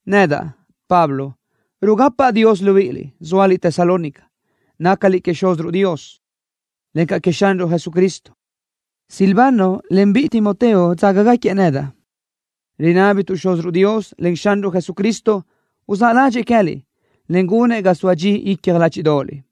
Nedaʼ, Pablo, rugapaʼ Dios libíʼiliʼ, zóaliʼ Tesalónica. Nácaliʼ queëʼ Xúziruʼ Dios, encaʼ queëʼ Xanruʼ Jesucristo. Silvano, en biʼi Timoteo dzágagaquiëʼ nedaʼ. Rinábituʼ Xúziruʼ Dios, en Xanruʼ Jesucristo, uzáʼ ládxëʼë queë́liʼ, en gunëʼ ga soa dxi icja ládxiʼdoʼoliʼ.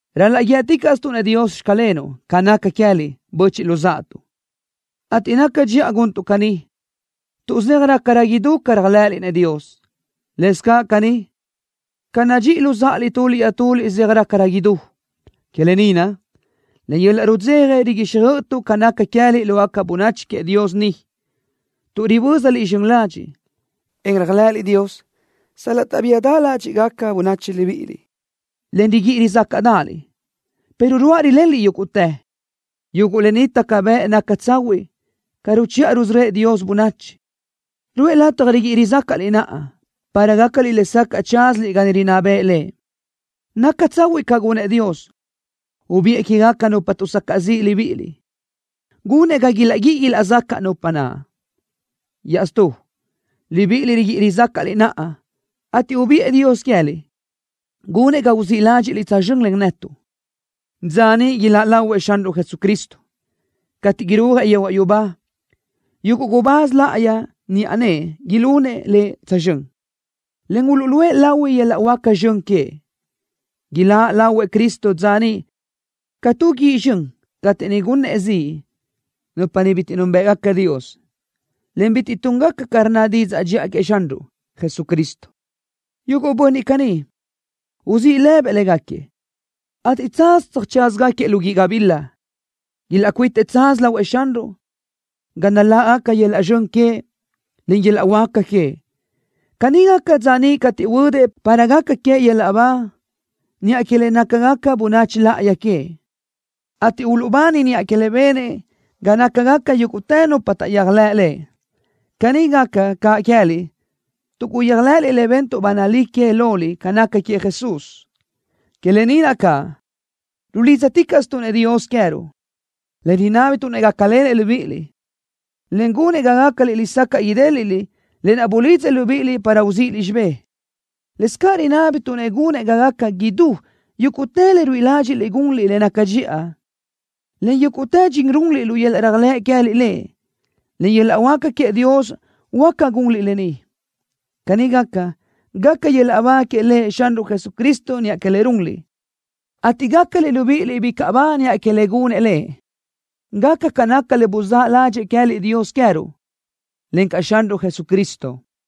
Ral-laʼ guíëticaʼstuʼ-nëʼ Dios: “Xclenuʼ” ca naca queë́liʼ, böchiʼ luzáʼatuʼ, ateʼ naca dxiʼa guntuʼ caní, tuʼ zeaj rácarö idú ca réajlëʼëliʼ-nëʼ Dios. Lëscaʼ caní, ca nadxíʼiliʼ luzáʼaliʼ tuliʼ iaʼtuliʼ zeaj rácarö idú. Que lë ni naʼ, len yöl-laʼ rudzeja riguíxjöʼötuʼ ca naca queë́liʼ lógaca bönachi queëʼ Dios ni, tuʼ ribö́zaliʼ zxön ladxiʼ, en réajlëʼëliʼ Dios sal-laʼ taʼbíadaʼ ládxiʼgaca bönachi libíʼiliʼ, en riguíʼi rizácaʼdaʼaliʼ, pero ruáʼ rilenliʼ yúguʼtë. Yuguʼ lë ni taca bëʼ naca tsahuiʼ ca ruchiʼa rusörö́ëʼ Dios bönachi. Ruʼë lataj riguíʼi rizácaʼliʼ naʼa, para gácaliʼ lesacaʼ tsázaliʼ ga niʼ rinná bëʼë Lëʼ. Naca tsahuiʼ ca gunëʼ Dios, ubiʼë quégaca nupa tuʼsacaʼ ziʼ libíʼiliʼ, gunëʼ ga ilaʼguíʼi ilaʼzacaʼ nupa naʼ. Iaʼstú, libíʼiliʼ riguíʼi rizácaʼliʼ naʼa, ateʼ ubiʼë Dios queë́liʼ, gunëʼ ga uzíʼ ládxiʼliʼ tsözxö́n len netuʼ, dza niʼ iláʼ lahuëʼ Xanruʼ Jesucristo, cateʼ irúajëʼ yehuaʼ yubá. Yuguʼ gubáz láʼayi niʼa nëʼë ilunëʼ Lëʼ tsözxö́n, en uluʼluʼë lahui yöl-laʼ huáca zxön queëʼ. Iláʼ lahuëʼ Cristo dza niʼ ca tu guíʼ zxön cateʼ niʼ gunëʼ ziʼ nupa bitiʼ núnbëʼgaca Dios, en bitiʼ túngaca ca rnna didzaʼ dxiʼa queëʼ Xanruʼ Jesucristo. Yuguʼ bönniʼ caní, uzíʼ lëbëʼ légaquiëʼ, ateʼ tsaz tsöjtsázagaquiëʼ lu guíʼ gabila. Ilaʼcuitëʼ tsaz lahuëʼ Xanruʼ, ga naláʼgaca yöl-laʼ zxön queëʼ, en yöl-laʼ huáca queëʼ. Caní gaca dza niʼ cateʼ huödëʼ para gaca queëʼ yöl-laʼ ba niʼa que le nácagaca bönachi láʼayi queëʼ, ateʼ uluʼbani niʼa que le benëʼ ga nácagaca yúguʼtë nupa taʼyéajlëʼ Lëʼ. Caní gaca caʼ queë́liʼ tuʼ guyéajlëʼëliʼ le bentuʼ ba nalí que loliʼ ca naca queëʼ Jesús. Que lë ni naʼ caʼ, rulídzaticaʼstuʼ-nëʼ Dios queë́ruʼ, en rinábituʼ-nëʼ gácalenëʼ libíʼiliʼ, en gunëʼ ga gácaliʼ lesacaʼ idéliʼliʼ lë naʼ bulidzëʼ libíʼiliʼ para uzíʼiliʼ xibé. Lëscaʼ rinábituʼ-nëʼ gunëʼ ga gaca idú yúguʼtë le ruíʼi ládxiʼliʼ gunliʼ le naca dxiʼa, en yúguʼtë dxin runliʼ lu yöl-laʼ réajlëʼ queë́liʼ Lëʼ. Len yöl-laʼ huáca queëʼ Dios huáca gunliʼ lë ni. Caní gaca, gaca yöl-laʼ ba que Lëʼ Xanruʼ Jesucristo niʼa que le runliʼ, ateʼ gácaliʼ libíʼiliʼ bicaʼ ba niʼa que le gunëʼ Lëʼ, gaca ca naca le buzáʼ ládxëʼë queë́liʼ Dios queë́ruʼ, encaʼ Xanruʼ Jesucristo.